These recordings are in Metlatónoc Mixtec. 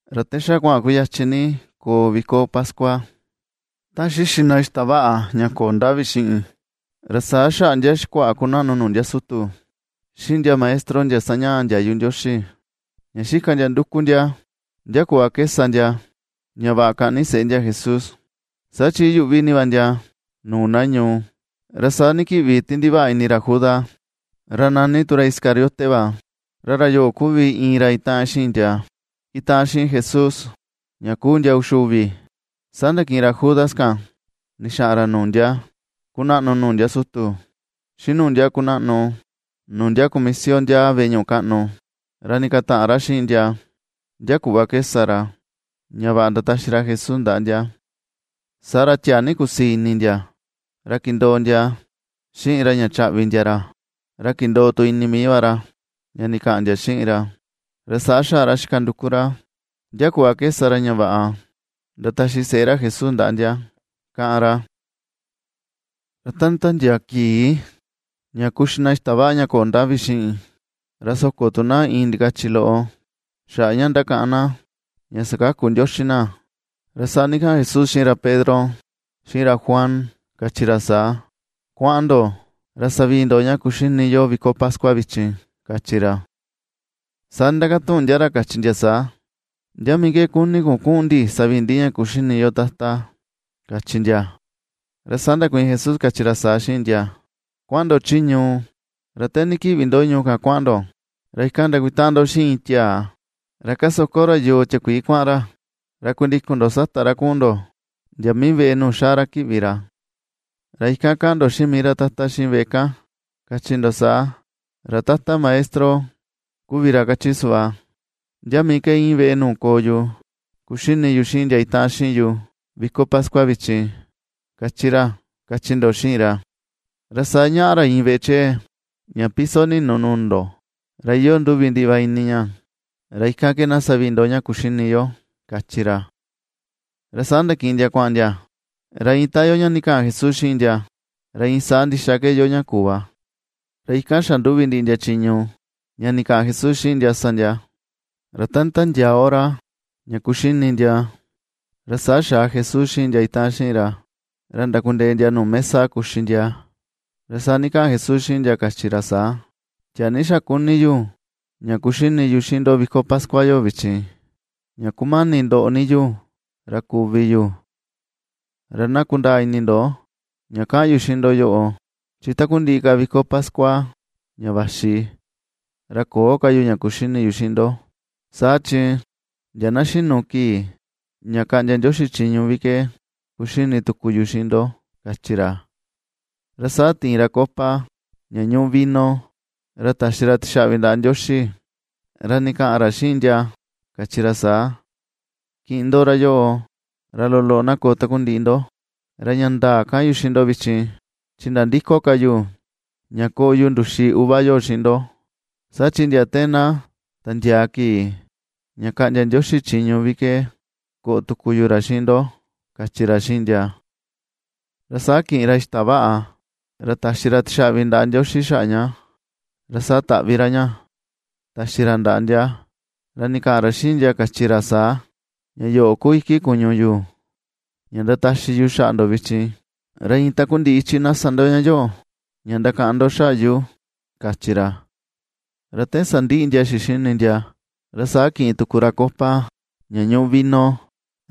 Ra ta xa kuaꞌan kuyachin ni ña koo viko pascua, ta xixi na xita vaꞌa ña köo ndavi xiꞌin, ra saa xaꞌa ndia xikuaꞌa kunaꞌnu nuu ndia sutu, xiꞌin ndia maestro sañaꞌa ndiayu Ndioxi, ña xika ndia nduku ndia ndia kuꞌva ke sa ndia ña vaꞌa kaꞌni seꞌe ndia Jesús, saa chi iyuꞌvi ni va ndia nuu na ñuu. Ra saa ndikiꞌvi ti ndivaꞌa ini ra Judas, ra nani tu ra Iscariote va, ra ra yoꞌo kuvi iin ra itaꞌan xiꞌin ndia itaꞌan xiꞌin Jesús ña kuu ndia uxi uvi. Saa ndakiꞌin ra Judas kan ndixaꞌan ra nuu ndia kunaꞌnu nuu ndia sutu, xiꞌin nuu ndia kunaꞌnu nuu ndia kumisio ndiaa veꞌe ñuꞌu kaꞌnu, ra ndikataꞌan ra xiꞌin ndia, ndia kuꞌva ke sa ra ña vaꞌa ndataxi ra Jesús ndaꞌa ndia. Saa ra tiaa ni kusii ini ndia, ra kindoo ndia xiꞌin ra ña chaꞌvi ndia ra. Ra kindoo tu ini mii va ra ña ndikaꞌan ndia xiꞌin ra, ra saa xaꞌa ra xika nduku ra ndia kuꞌva ke sa ra ña vaꞌa ndataxi seꞌe ra Jesús ndaꞌa ndia, kaꞌan ra. Ra ta nditiandiaa kii ña kuxi na xita vaꞌa ña köo ndavi xiꞌin, ra soko tu na iin ndikachi loꞌo xaꞌa ña ndakaꞌan na ña sakaku Ndioxi na, ra saa ndikaꞌan Jesús xiꞌin ra Pedro, xiꞌin ra Juan, kachi ra saa: ―Kuaꞌan ndo, ra savii ndo ña kuxini yo viko pascua vichin ―kachi ra. Saa ndindakatuꞌun ndia ra, kachi ndia saa: ―¿Ndia mii ke kuni kun kuꞌun ndi savii ndi ña kuxini yo Tata? ―kachi ndia. Ra saa ndakuiin Jesús, kachi ra saa xiꞌin ndia: ―Kuaꞌan ndo chi ñuu, ra te ndikiꞌvi ndo ñuu kan kuaꞌan ndo ra ikan ndakutaꞌan ndo xiꞌin iin tiaa ra kasoko ra yoo tiakuii kuaꞌan ra. Ra kundikun ndo sata ra kuꞌun ndo ndia mii veꞌe nuu xaa ra kiꞌvi ra. Ra ikan kaꞌan ndo xiꞌin mii ra tata xiꞌin veꞌe kan, kachi ndo saa: “Ra Tata Maestro kuvi ra kachi suꞌva: ¿Ndia mii ke íin veꞌe nuu koo yu kuxini yu xiꞌin ndia itaꞌan xiꞌin yu viko pascua vichin?, kachi ra”, kachi ndo xiꞌin ra. Ra saa ñaꞌa ra iin veꞌe chee ña piso ninu nuu ndo, ra iyoo nduvi ndiꞌi va ini ña; ra ikan ke na savii ndo ña kuxini yo ―kachi ra. Ra saa ndakiꞌin ndia kuaꞌan ndia, ra iin ta iyoo ña ndikaꞌan Jesús xiꞌin ndia, ra iin saa ndixa ke iyoo ña kuu va, ra ikan xanduvi ndiꞌi ndia chiñu ña ndikaꞌan Jesús xiꞌin ndia sa ndia. Ra ta nditandiaa hora ña kuxini ndia, ra saa xaa Jesús xiꞌin ndia itaꞌan xiꞌin ra, ra ndakundee ndia nuu mesa ña kuxi ndia. Ra saa ndikaꞌan Jesús xiꞌin ndia, kachi ra saa: ―Tiaa ni xa kuni yu, ña kuxini yu xiꞌin ndo viko pascua yoꞌo vichin, ña kumani ndoꞌo ni yu, ra kuvi yu. Ra na kundaa ini ndo ña kaꞌan yu xiꞌin ndo yoꞌo, chi takundiꞌi ka viko pascua ña vaxi ra köo ka yu ña kuxini yu xiꞌin ndo. Saa chi ndia na xinu kii ña kaꞌndia Ndioxi chiñu vi ke kuxini tuku yu xiꞌin ndo ―kachi ra. Ra saa tiin ra copa ña ñuꞌu vino, ra taxi ra taxaꞌvi ndaꞌa Ndioxi, ra ndikaꞌan ra xiꞌin ndia, kachi ra saa: ―Kiꞌin ndo ra yoꞌo, ra loloꞌo na koꞌo takundiꞌi ndo. Ra ña ndaa kaꞌan yu xiꞌin ndo vichin, chi nandïko ka yu ña koꞌo yu nduxi uva yoꞌo xiꞌin ndo, saa chi ndia te na tandiaa kii ña kaꞌndia Ndioxi chiñu vi ke koꞌo tuku yu ra xiꞌin ndo ―kachi ra xiꞌin ndia. Ra saa kiꞌin ra xita vaꞌa ra taxi ra tixaꞌvi ndaꞌa Ndioxi xaꞌa ña, ra saa taꞌvi ra ña taxi ra ndaꞌa ndia, ra ndikaꞌan ra xiꞌin ndia, kachi ra saa: ―Ña yoꞌo ku iki kuñu yu, ña ndataxi yu xaꞌa ndo vichin. Ra iin takundiꞌi ichi na sa ndo ña yoꞌo ña ndakaꞌan ndo xaꞌa yu ―kachi ra. Ra te sandiꞌi ndia xixini ndia, ra saa kiꞌin tuku ra copa ña ñuꞌu vino,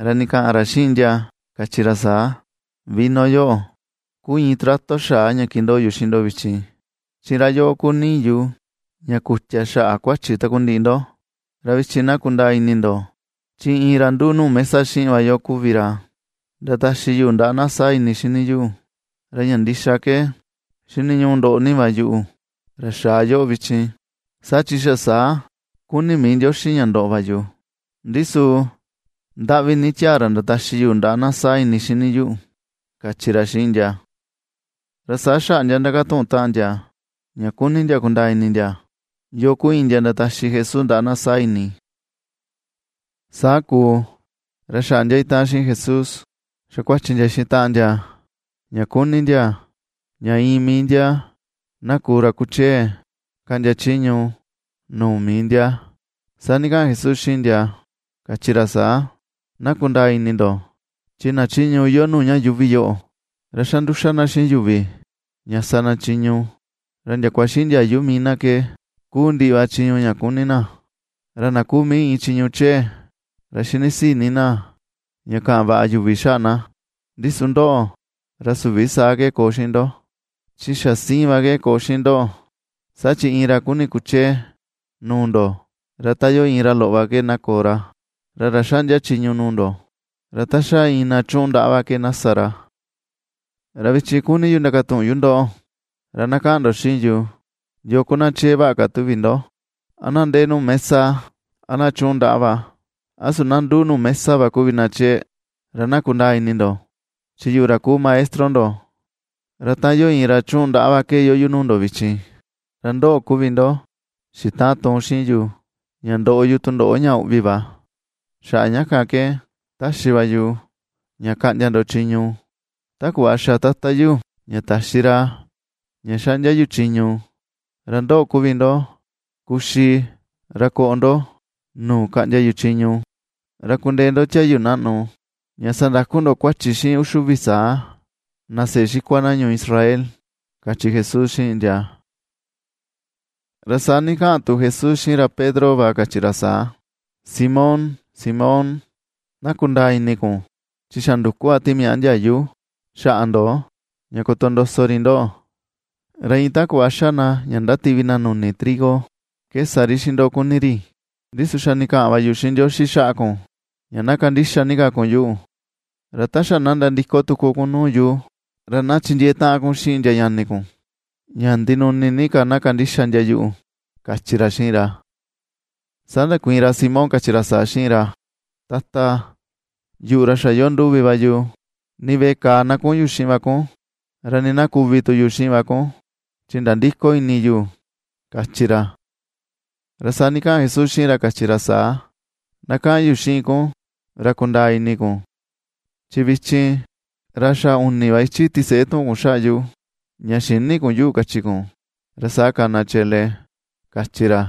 ra ndikaꞌan ra xiꞌin ndia kachi ra saa: ―Vino yoꞌo ku iin trato xaa ña kindoo yu xiꞌin ndo vichin, chi ra yoꞌo ku nii yu ña kutia xaꞌa kuachi takundiꞌi ndo. ’Ra vichin na kundaa ini ndo, chi iin ra nduꞌu nuu mesa xiꞌin va yu kuvi ra ndataxi yuꞌu ndaꞌa na saa ini xini yuꞌu. Ra ña ndixa ke xiniñuꞌu ndoꞌo ni va yuꞌu, ra xaa yoꞌo vichin, saa chi xa saa kuni mii Ndioxi ña ndoꞌo va yu, ndi su ¡ndaꞌvi ni tiaa ra ndataxi yuꞌu ndaꞌa na saa ini xini yuꞌu! ―kachi ra xiꞌin ndia. Ra saa xaꞌa ndia ndakatuꞌun taꞌan ndia, ña kuni ndia kundaa ini ndia, yoo ku iin ndia ndataxi Jesús ndaꞌa na saa ini. Saa kuu, ra xaꞌa ndia itaꞌan xiꞌin Jesús xa kuachi ndia xiꞌin taꞌan ndia, ña kuni ndia ña iin mii ndia na kuu ra kuchee kaꞌndia chiñu nuu mii ndia. Saa ndikaꞌan Jesús xiꞌin ndia, kachi ra saa: ―Na kundaa ini ndo, chi na chiñu iyoo nuu ña yuuvi yoꞌo, ra xa nduxa na xiꞌin yuvi ña na sa na chiñu, ra ndiakua xiꞌin ndiayu mii na ke kuu ndiꞌi va chiñu ña kuni na. Ra na kuu mii iin chiñu chee, ra xinisii ni na ña kaꞌan vaꞌa yuvi xaꞌa na. Ndi su ndoꞌo, ra süvi saa ke koo ndo, chi xa siin va ke koo xiꞌin ndoꞌo. Saa chi iin ra kuni kuchee nuu ndo ra ta iyoo iin ra loꞌo va ke na koo ra, ra ra xaꞌndia chiñu nuu ndo, ra ta xa iin na chuꞌun ndaꞌa va ke na sa ra. ’Ra vichin kuni yu ndakatuꞌun yu ndoꞌo, ra na kaꞌan ndo xiꞌin yu, ¿yoo ku na chee vaꞌa ka tuvi ndo, a na ndee nuu mesa, a na chuꞌun ndaꞌa va? ¿A su na nduꞌu nuu mesa va kuvi na chee? Ra na kundaa ini ndo, chi yuꞌu ra kuu maestro ndo, ra ta iyoo iin ra chuꞌun ndaꞌa va ke iyoo yu nuu ndo vichin. ’Ra ndoꞌo kuvi ndo xitaꞌan tuun xiꞌin yu ña ndoꞌo yu tundoꞌo ña uꞌvi va. Ra xaꞌa ña kan ke ^taxi va yu ña kaꞌndia ndo chiñu, ta kuꞌva xa Tata yu ña taxi ra ña xaꞌndia yu chiñu. Ra ndoꞌo kuvi ndo kuxi ra koꞌo ndo nuu kaꞌndia yu chiñu. Ra kundee ndo tiayu naꞌnu ña sandaku ndo kuachi xiꞌin uxi uvi saa na seꞌe xikua na ñuu Israel ―kachi Jesús xiꞌin ndia. Ra saa ndikaꞌan tu Jesús xiꞌin ra Pedro va, kachi ra saa: ―Simón, Simón, na kundaa ini kun chi xa nduku va timiaꞌa ndiayu xaꞌa ndo ña kotondoso ri ndoꞌo. Ra iin ta kuꞌva xa na ña ndativi na nuni trigo, ke sa ri xiꞌin ndo kuni ri. Ndi su xa ndikaꞌan va yu xiꞌin Ndioxi xaꞌa kun, ña na kandixa ni ka kun yuꞌu, ra ta xa na nandiko tuku kun nuu yu, ra na chindiee taꞌan kun xiꞌin ndia ñani kun, ña ndinuni ni ka na kandixa ndia yuꞌu ―kachi ra xiꞌin ra. Saa ndakuiin ra Simón, kachi ra saa xiꞌin ra: ―Tata, yuꞌu ra xa iyoo nduvi va yu, nii veꞌe kàà na kuꞌun yu xiꞌin va kun, ra nii na kuvi tu yu xiꞌin va kun chi nandïko ini yu ―kachi ra. Ra saa ndikaꞌan Jesús xiꞌin ra, kachi ra saa: ―Na kaꞌan yu xiꞌin kun ra kundaa ini kun, chi vichin ra xa uni va ichi tiseꞌe tuꞌun kun xaꞌa yu, ña xïni kun yuꞌu kachi kun, ra saa kana chele ―kachi ra.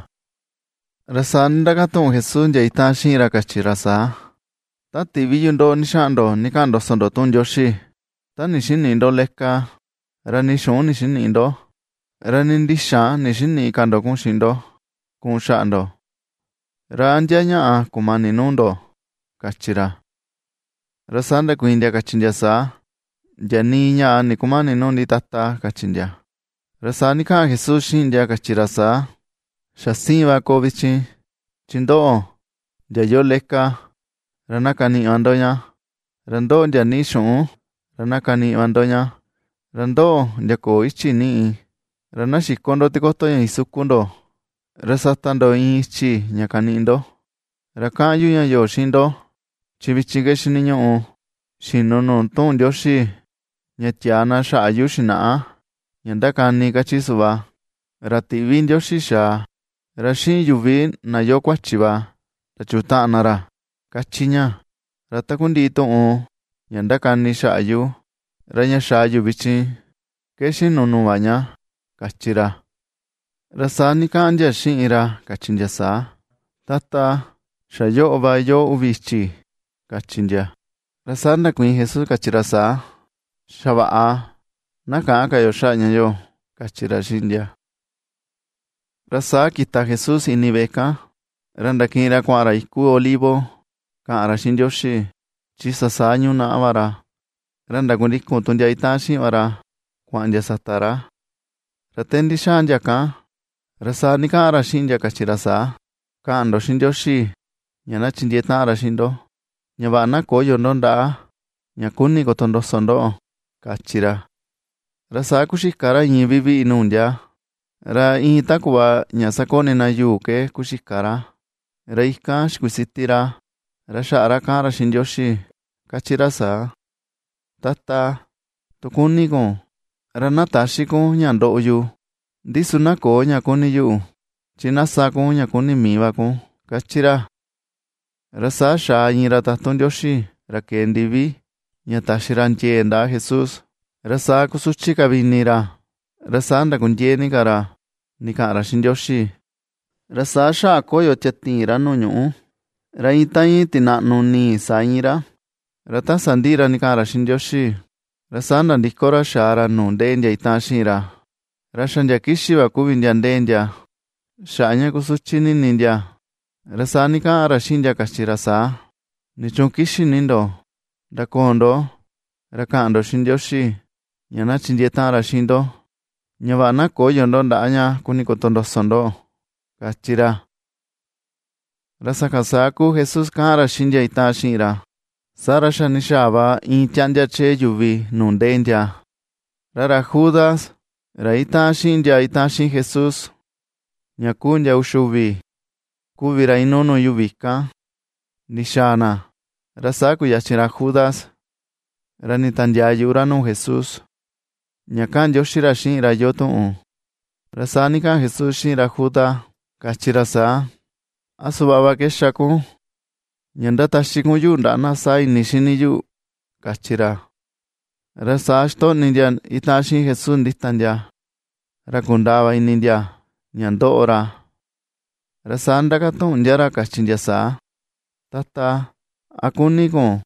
Ra saa ndindakatuꞌun Jesús ndia itaꞌan xiꞌin ra kachi ra saa: ―Ta tiꞌvi yu ndoꞌo ndixaꞌan ndo ndikaꞌan ndoso ndo tuꞌun Ndioxi, ta ndixinïꞌi ndo leka, ra nii xuꞌun ndixinïꞌi ndo, ra nii ndixan ndixinïꞌi ka ndo kuꞌun xiꞌin ndo kuꞌun xaꞌa ndo, ¿ra a ndia ñaꞌa kumani nuu ndo? ―kachi ra. Ra saa ndakuiin ndia, kachi ndia saa: ―Ndia nii ñaꞌa ndikumäni nuu ndi, Tata ―kachi ndia. Ra saa ndikaꞌan Jesús xiꞌin ndia, kachi ra saa: ―Xa siin va koo vichin, chi ndoꞌo, ndia iyoo leka, ra na kaniꞌi va ndo ña, ra ndoꞌo, ndia niꞌi xuꞌun, ra kaniꞌi va ndo ña, ra ndoꞌo, ndia köo ichi niꞌi, ra na xiko ndo tikoto ña isukun ndo, ra sata ndo iin ichi ña kaniꞌi ndo. Ra kaꞌan yu ña yoꞌo xiꞌin ndo, chi vichin ke xiniñuꞌu xinu nuu tuꞌun Ndioxi ña tiaa na xaꞌa yu xinaꞌa ña ndakani kachi suꞌva: “Ra tiꞌvi Ndioxi xaa, ra xiꞌin yuvi na iyoo kuachi va ndachutaꞌan na ra”, kachi ña. Ra takundiꞌi tuꞌun ña ndakani xaꞌa yu, ra ña xaa yu vichin ke xinu nuu va ña ―kachi ra. Ra saa ndikaꞌan ndia xiꞌin ra, kachi ndia saa: ―Tata, xa yoꞌo va iyoo uvi ichi ―kachi ndia. Ra saa ndakuiin Jesús, kachi ra saa: ―Xa vaꞌa; na käꞌan ka yo xaꞌa ña yoꞌo ―kachi ra xiꞌin ndia. Ra saa kita Jesús ini veꞌe kan, ra ndakiꞌin ra kuaꞌan ra iku Olivo kaꞌan ra xiꞌin Ndioxi, chi xa saa yunaꞌa va ra. Ra ndakundikun tu ndia itaꞌan xiꞌin va ra kuaꞌan ndia sata ra. Ra te ndixaa ndia kan, ra saa ndikaꞌan ra xiꞌin ndia, kachi ra saa: ―Kaꞌan ndo xiꞌin Ndioxi ña na chindiee taꞌan ra xiꞌin ndo, ña vaꞌa na köyo ndo ndaꞌa ña kuni kotondoso ndoꞌo ―kachi ra. Ra saa kuxika ra iin viviꞌi nuu ndia, ra iin ta kuꞌva ña sakoꞌni na yuu ke kuxika ra; ra ikan xikusiti ra, ra xaꞌa ra kaꞌan ra xiꞌin Ndioxi, kachi ra saa: ―Tata, tu kuni kun, ra na täxi kun ña ndoꞌo yu. Ndi su na köo ña kuni yuꞌu, chi na sa kun ña kuni mii va va kun ―^kachi ra. Ra saa xaa iin ra tatun Ndioxi ra kee ndivi, ña taxi ra ndiee ndaꞌa Jesús. Ra saa kusuchi ka vi ini ra, ra saa ndakundiee ni ka ra ndikaꞌan ra xiꞌin Ndioxi, ra saa xaꞌa koyo tiatiin ra nuu ñuꞌu, ra iin ta iin tinaꞌnu nii saa íin ra. Ra ta sandiꞌi ra ndikaꞌan ra xiꞌin Ndioxi, ra saa nandiko ra xaa ra nuu ndee ndia itaꞌan xiꞌin ra, ra xa ndia kixi va kuvi ndia ndee ndia xaꞌa ña kusuchi ni ini ndia. Ra saa ndikaꞌan ra xiꞌin ndia, kachi ra saa: ―¿Nichuun kixi ni ndo? Ndakoo ndo ra kaꞌan ndo xiꞌin Ndioxi ña na chindiee taꞌan ra xiꞌin ndo, ña vaꞌa na köyo ndo ndaꞌa ña kuni kotondoso ndoꞌo ―kachi ra. Ra sakan saa kuu Jesús kaꞌan ra xiꞌin ndia itaꞌan xiꞌin ra, saa ra xa ndixaa va iin tiaꞌndia chee yuvi nuu ndee ndia. Ra ra Judas ra itaꞌan xiꞌin ndia itaꞌan xiꞌin Jesús ña kuu ndia uxi uvi kuvi ra inuu nuu yuvi kan ndixaa na, ra saa kuyachin ra Judas ra nditandiaa yuꞌu ra nuu Jesús ña kaꞌan ndioxi ra xiꞌin ra iyoo tuꞌun. Ra saa ndikaꞌan Jesús xiꞌin ra Judas, kachi ra saa: ―¿A suꞌva va ke xa kun ña ndataxi kun yuꞌu ndaꞌa na saa ini xini yuꞌu? ―kachi ra. Ra saa xitoꞌni ndia itaꞌan xiꞌin Jesús ndita ndia, ra kundaa va ini ndia ña ^ndoꞌo ra, ra saa ndindakatuꞌun ndia ra kachi ndia saa: ―Tata, ¿a kuni kun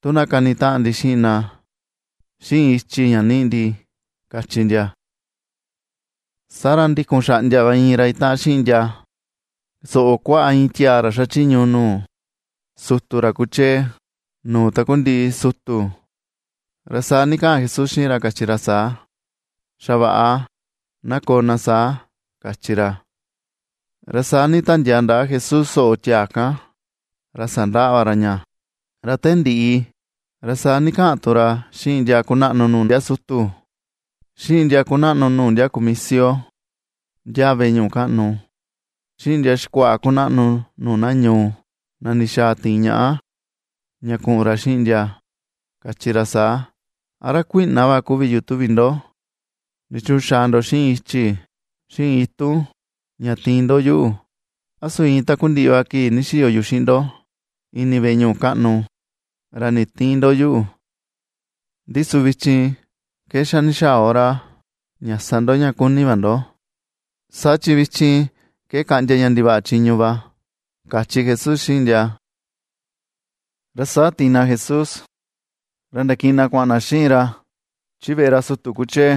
tu na kanitaꞌan ndi xiꞌin na, xiꞌin ichi ña niꞌi ndi? ―kachi ndia. Saa ra ndikun xaꞌndia va iin ra itaꞌan xiꞌin ndia soꞌo kuaꞌa iin tiaa ra xachiñu nuu sutu ra kuchee nuu takundiꞌi sutu. Ra saa ndikaꞌan Jesús xiꞌin ra, kachi ra saa: ―Xa vaꞌa, na koo na saa ―kachi ra. Ra saa nditiandiaa ndaꞌa Jesús soꞌo tiaa kan, ra sandaꞌa va ra ña. Ra te ndiꞌi, ra saa ndikaꞌan tu ra xiꞌin ndia kunaꞌnu nuu ndia sutu, xiꞌin ndia kunaꞌnu nuu ndia kumisio ndiaa veꞌe ñuꞌu kaꞌnu, xiꞌin ndia xikuaꞌa kunaꞌnu nuu na ñuu, na ndixaa tiin ñaꞌa, ña kuꞌun ra xiꞌin ndia, kachi ra saa: ―¿A ra kuiꞌna va kuvi yu tuvi ndo? ¿Nichuun xaa ndo xiꞌin ichi, xiꞌin itun ña tiin ndo yuꞌu? A su iin takundiꞌi va kii ndixiyo yu xiꞌin ndo ini veꞌe ñuꞌu kaꞌnu, ra nditïin ndo yuꞌu. Ndi su vichin ke xa ndixaa hora ña sa ndo ña kuni va ndo, saa chi vichin ke kaꞌndia ña ndivaꞌa chiñu va ―kachi Jesús xiꞌin ndia. Ra saa tiin na Jesús, ra ndakiꞌin na kuaꞌan na xiꞌin ra chi veꞌe ra sutu kuchee.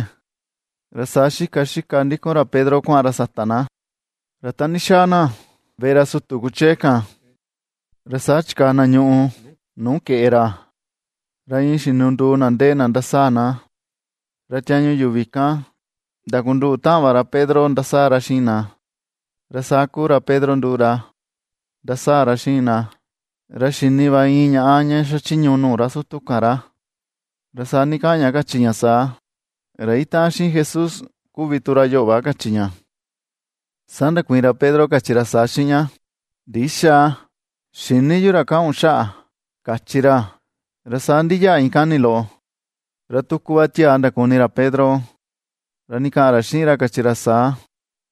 Ra saa xika xika ndikun ra Pedro kuaꞌan ra sata na. Ra te ndixaa na veꞌe ra sutu kuchee kan, saa chikaa na ñuꞌu nuu keꞌe ra, ra iin xinunduu na ndee na ndasaa na, ra tiañu yuvi kan ndakunduꞌu taꞌan va ra Pedro ndasaa ra xiꞌin na. Ra saa kuu ra Pedro nduꞌu ra ndasaa ra xiꞌin na. Ra xini va iin ñaꞌa ña xachiñu nuu ra sutu kan ra, ra saa ndikaꞌan ña, kachi ña saa: ―Ra itaꞌan xiꞌin Jesús kuvi tu ra yoꞌo va ―kachi ña. Saa ndakuiin ra Pedro, kachi ra saa xiꞌin ña: ―Ndïxa, xïni yu ra kaꞌan kun xaꞌa ―kachi ra. Ra saa ndiyaꞌa iin kani loꞌo, ra tuku va tiaa ndakuni ra Pedro, ra ndikaꞌan ra xiꞌin ra, kachi ra saa: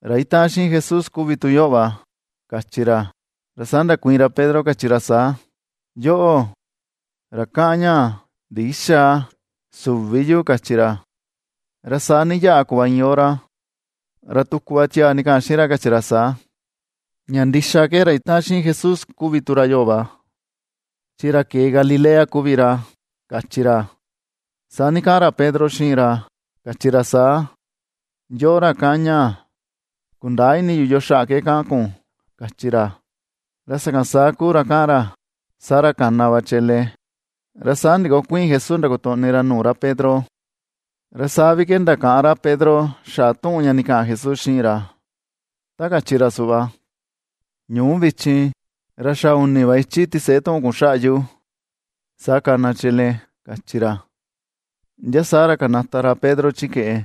―Ra itaꞌan xiꞌin Jesús kuvi tu yoꞌo va ―kachi ra. Ra saa ndakuiin ra Pedro, kachi ra saa: ―Yoꞌo, ra kaꞌan ñaa, ndïxa. Süvi yu ―kachi ra. Ra saa ndiyaꞌa kuꞌva iin hora, ra tuku va tiaa ndikaꞌan xiꞌin ra, kachi ra saa: ―Ña ndixa ke, ra itaꞌan xiꞌin Jesús kuvi tu ra yoꞌo va, chi ra kee Galilea kuvi ra ―kachi ra. Saa ndikaꞌan ra Pedro xiꞌin ra, kachi ra saa: ―Yoꞌo, ra kaꞌan ñaa, kundäa ini yu yoo xaꞌa ke kaꞌan kun ―kachi ra. Ra sakan saa kuu ra kaꞌan ra, saa ra kana va chele. Ra saa ndikokuiin Jesús ndakotoꞌni ra nuu ra Pedro, ra saa vi ke ndakaꞌan ra Pedro xaꞌa tuꞌun ña ndikaꞌan Jesús xiꞌin ra, ta kachi ra suꞌva: “Ñuu vichin ra xa uni va ichi tiseꞌe tuꞌun kun xaꞌa yu, ra saa kana chele”, kachi ra. Ndia saa ra kanata ra Pedro chi keꞌe,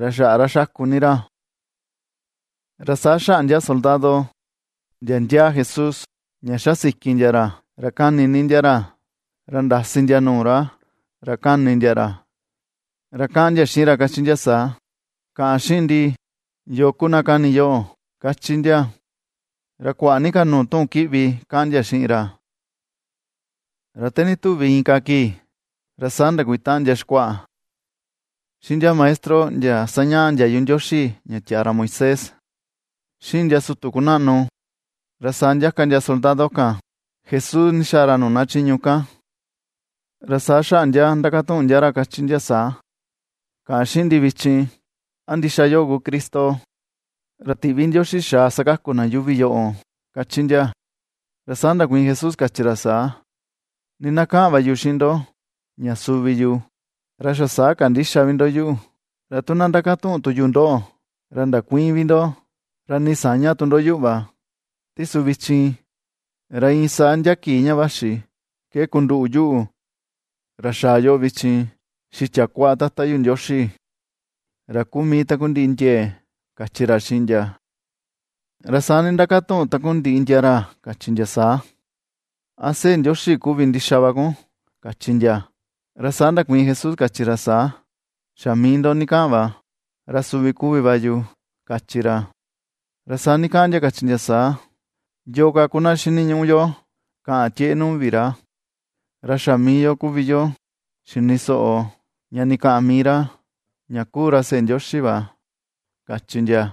ra xaꞌa ra xaku ni ra. Ra saa xaꞌa ndia soldado, ndia ndiaa Jesús ña ^xa siki ndia ra, ra kani ni ndia ra. Ra ndasi ndia nuu ra, ra kani ndia ra, ra kaꞌan ndia xiꞌin ra, kachi ndia saa: ―Kaꞌan xiꞌin ndi, ¿yoo ku na kani yoꞌo? ―kachi ndia. Ra kuaꞌa ni ka nuu tuꞌun kiꞌvi kaꞌan ndia xiꞌin ra. Ra te ndituvi inka kii, ra saa ndakutaꞌan ndia xikuaꞌa, xiꞌin ndia maestro sañaꞌa ndiayu Ndioxi ña tiaa ra Moisés, xiꞌin ndia sutu kunaꞌnu, ra saa ndiaka ndia soldado kan Jesús ndixaa ra nuu na chiñu kan. Ra saa xaꞌa ndia ndakatuꞌun ndia ra kachi ndia saa: ―Kaꞌan xiꞌin ndi vichin, ¿a ndixa yoꞌo ku Cristo ra tiꞌvi Ndioxi xaa sakaku ña yuuvi yoꞌo? ―kachi ndia. Ra saa ndakuiin Jesús, kachi ra saa: ―Nii na kaꞌan va yu xiꞌin ndo ña suvi yu, ra xa saa kandïxa vi ndo yuꞌu. Ra tu na ndakatuꞌun tu yu ndoꞌo, ra ndakuïin vi ndo, ra nii saña tu ndo yuꞌu va. Ndi su vichin, ra iin saa ndia kii ña vaxi ke kunduꞌu yuꞌu, ra xaa yoꞌo vichin, xitia kuaꞌa Tata yu Ndioxi ra kuu mii takundiꞌi ndiee ―kachi ra xiꞌin ndia. Ra saa ndindakatuꞌun takundiꞌi ndia ra, kachi ndia saa: ―¿A Seꞌe Ndioxi kuvi ndixa va kun? ―kachi ndia. Ra saa ndakuiin Jesús, kachi ra saa: ―Xa mii ndo ndikaꞌan va, ra suvi kuvi va yu ―kachi ra. Ra saa ndikaꞌan ndia, kachi ndia saa: ―Yoo ka ku na xiniñuꞌu yo kaꞌan tieꞌe nuu vi ra, ra xa mii yo kuvi yo xini soꞌo, ña ndikaꞌan mii ra ña ku ra seꞌe Ndioxi va ―kachi ndia.